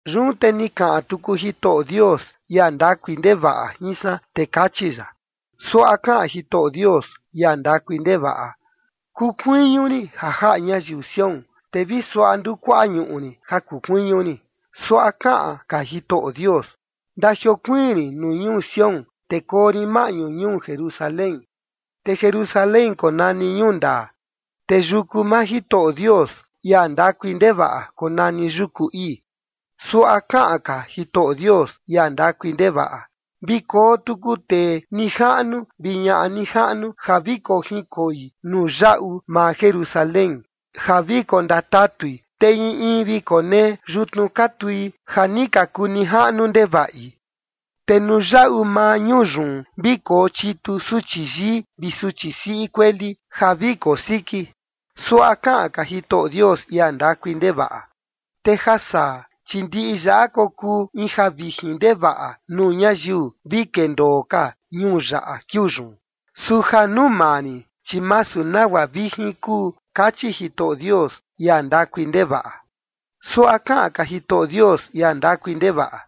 Yun te ni kaꞌan tuku Jitoꞌo Dios, ia ndakui ndevaꞌa jin san, te kachi ya: “Suaꞌa kaꞌan Jitoꞌo Dios, ia ndakui ndevaꞌa: Kuu kuiñu rin ja jaꞌa ñayiu Sión, te vi suaꞌa ndukuaꞌa ñuꞌu rin ja kuu kuiñu rin. Suaꞌa kaꞌan ka Jitoꞌo Dios: Ndajiokuiin rin ñuu Sión, te koo rin maꞌñu ñuu Jerusalén. Te Jerusalén konani Ñuu Ndaa, te yuku maa Jitoꞌo Dios, ia ndakui ndevaꞌa, konani yuku ii.” Suaꞌa kaꞌan ka Jitoꞌo Dios, ia ndakui ndevaꞌa: “Vi koo tuku tee nijaꞌnu vi ñaꞌa nijaꞌnu ja vi kojinkoi nuu yaꞌu maa Jerusalén ja vi kondatatui, te in in vi konee yutnu ka tui ja ni ka kuu nijaꞌnu ndevaꞌi. Te nuu yaꞌu maa ñuu yun vi kochitu suchi yii vi suchi siꞌi kueli ja vi kosiki.” Suaꞌa kaꞌan ka Jitoꞌo Dios, ia ndakui ndevaꞌa: “Te ja saa, chi ndiꞌi yaꞌa kokuu in javijin ndevaꞌa nuu ñayiu vi kendoo ka ñuu yaꞌa kiuu yun. Su ja nuu maa rin, chi masu nagua vijin kuu”, kachi Jitoꞌo Dios, ia ndakui ndevaꞌa. Suaꞌa kaꞌan ka Jitoꞌo Dios, ia ndakui ndevaꞌa: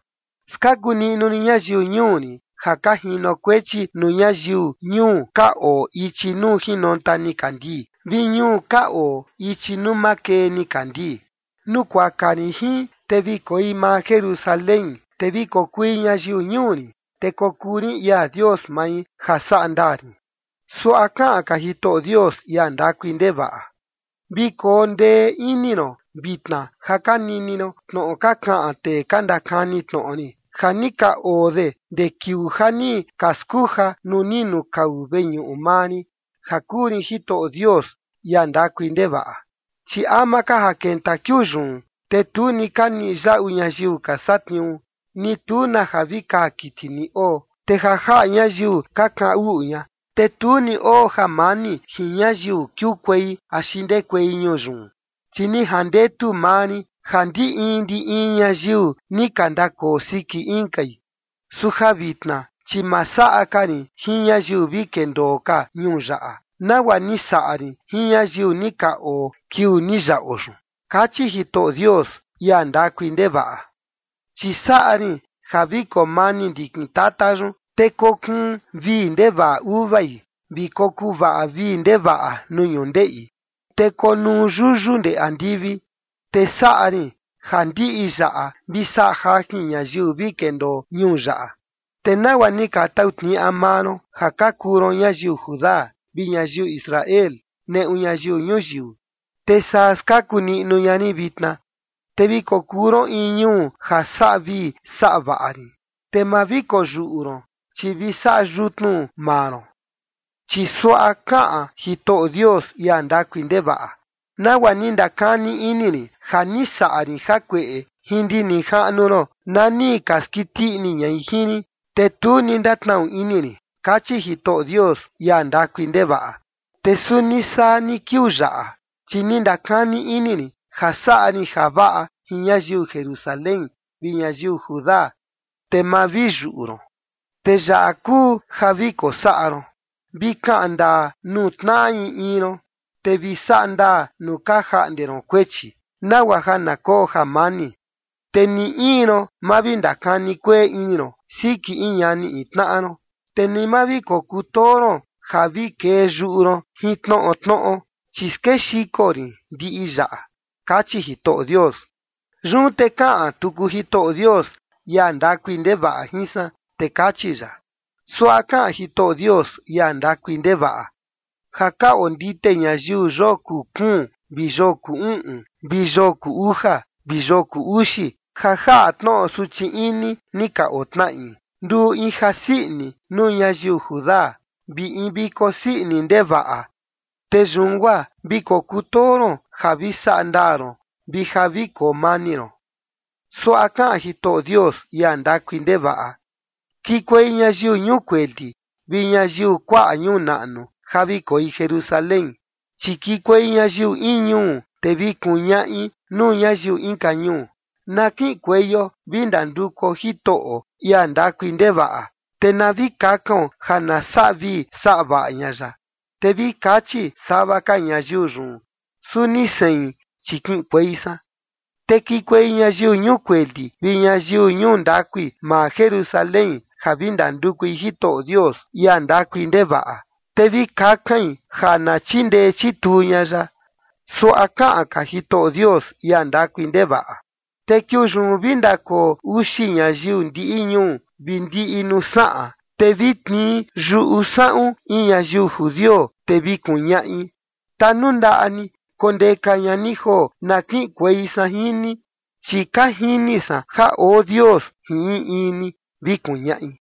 “Skaku niꞌnu rin ñayiu ñuu rin, ja ka jinokuechi nuu ñayiu ñuu ka oo ichi nuu jinonta nikandii vi ñuu ka oo ichi nuu makee nikandii. Nukuaka rin jin, te vi koi maa Jerusalén, te vi kokui ñayiu ñuu rin, te kokuu rin ia Dios mai, ja saꞌa ndaa rin.” Suaꞌa kaꞌan ka Jitoꞌo Dios, ia ndakui ndevaꞌa: “Vi koo ndee ini ron vitna ja ka nini ron tnoꞌo ka kaꞌan tee ka ndakani tnoꞌo rin, ja ni ka oo de ndee kiuu ja ni ka skuja nuu ni nukau veñuꞌu maa rin ja kuu rin Jitoꞌo Dios, ia ndakui ndevaꞌa. Chi ama ka ja kenta kiuu yun, te tu ni ka niꞌi yaꞌu ñayiu ka satniuu, ni tu na ja vi kaa kiti ni oo, te ja jaꞌa ñayiu ka kaꞌan uꞌu ña, te tu ni oo jamani jin ñayiu kiukuei axi ndekuei ñuu yun, chi ni jandetu maa rin ja ndi in ndi in ñayiu ni ka ndakoo siki inkai. Su ja vitna, chi ma saꞌa ka rin jin ñayiu vi kendoo ka ñuu yaꞌa, nagua ni saꞌa rin jin ñayiu ni ka oo kiuu ni yaꞌo yun” kachi Jitoꞌo Dios, ia ndakui ndevaꞌa. “Chi saꞌa rin ja vi koo mani ndikin tata yun, te kokuun vii ndevaꞌa uvai, vi kokuvaꞌa vii ndevaꞌa nuu ñundeꞌi, te konuu yuyu ndee andivi, te saꞌa rin ja ndiꞌi yaꞌa vi saꞌa jajin ñayiu vi kendoo ñuu yaꞌa. Te nagua ni ka tau tniaꞌa maa ron ja ka kuu ron ñayiu Judá vi ñayiu Israel neꞌu ñayiu ñuyiu, te saa skaku niꞌnu ña rin vitna, te vi kokuu ron in ñuu ja saꞌa vii saꞌa vaꞌa rin. Te ma vi koyuꞌu ron, chi vi saꞌa yutnu maa ron.” Chi suaꞌa kaꞌan Jitoꞌo Dios, ia ndakui ndevaꞌa: “Nagua ni ndakani ini rin ja ni saꞌa rin jakueꞌe jin ndi nijaꞌnu ron na ni ka skiti ini ñai jin rin, te tu ni ndatnaꞌu ini rin”, kachi Jitoꞌo Dios, ia ndakui ndevaꞌa. “Te suni saa ni kiuu yaꞌa, chi ni ndakani ini rin ja saꞌa rin javaꞌa jin ñayiu Jerusalén vi ñayiu Judá, te ma vi yuꞌu ron. Te yaꞌa kuu ja vi kosaꞌa ron: Vi kaꞌan ndaa nuu tnaꞌa in in ron, te vi saꞌa ndaa nuu ka jaꞌnde ron kuechi, nagua ja na koo jamani. Te ni in ron, ma vi ndakani kueꞌe ini ron siki in ñani in tnaꞌa ron, te ni ma vi kokutoo ron ja vi kee yuꞌu ron jin tnoꞌo tnoꞌo, chi skexiko rin ndiꞌi yaꞌa”, kachi Jitoꞌo Dios. Yun te kaꞌan tuku Jitoꞌo Dios, ia ndakui ndevaꞌa jin san, te kachi ya: “Suaꞌa kaꞌan Jitoꞌo Dios, ia ndakui ndevaꞌa: Ja ka ondite ñayiu yoo kuu kuun vi yoo kuu uꞌun vi yoo kuu uja vi yoo kuu uxi ja jaꞌa tnoꞌo suchi ini ni ka otnaꞌi, nduu in jasii ini nuu ñayiu Judá vi in viko sii ini ndevaꞌa. Te yun guaa vi kokutoo ron ja vi saꞌa ndaa ron vi ja vi koo mani ron.” Suaꞌa kaꞌan Jitoꞌo Dios, ia ndakui ndevaꞌa: “Kikuei ñayiu ñuu kueli vi ñayiu kuaꞌa ñuu naꞌnu ja vi koi Jerusalén. Chi kiꞌinkuei ñayiu in ñuu, te vi kuñaꞌi nuu ñayiu inka ñuu: Na kiꞌinkueio vi ndandukuo Jitoꞌo, ia ndakui ndevaꞌa, te na vi kakaon ja na saꞌa vii saꞌa vaꞌa ña ya. Te vi kachi sava ka ñayiu yun: Suni sein, chi kiꞌinkuei san.” Te kikuei ñayiu ñuu kueli vi ñayiu ñuu ndakui, maa Jerusalén, ja vi ndandukui Jitoꞌo Dios, ia ndakui ndevaꞌa, te vi kakain ja na chindee chituu ña ya. Suaꞌa kaꞌan ka Jitoꞌo Dios, ia ndakui ndevaꞌa: “Te kiuu yun vi ndakoo uxi ñayiu ndiꞌi ñuu vi ndiꞌi nuu saꞌan, te vi tnii yuꞌu saꞌun in ñayiu judio, te vi kuñaꞌi: Tanundaꞌa ni kondeka ña ni joo na kiꞌinkuei san jin ni, chi ka jini san ja oo Dios jin in in ni, vi kuñaꞌi”.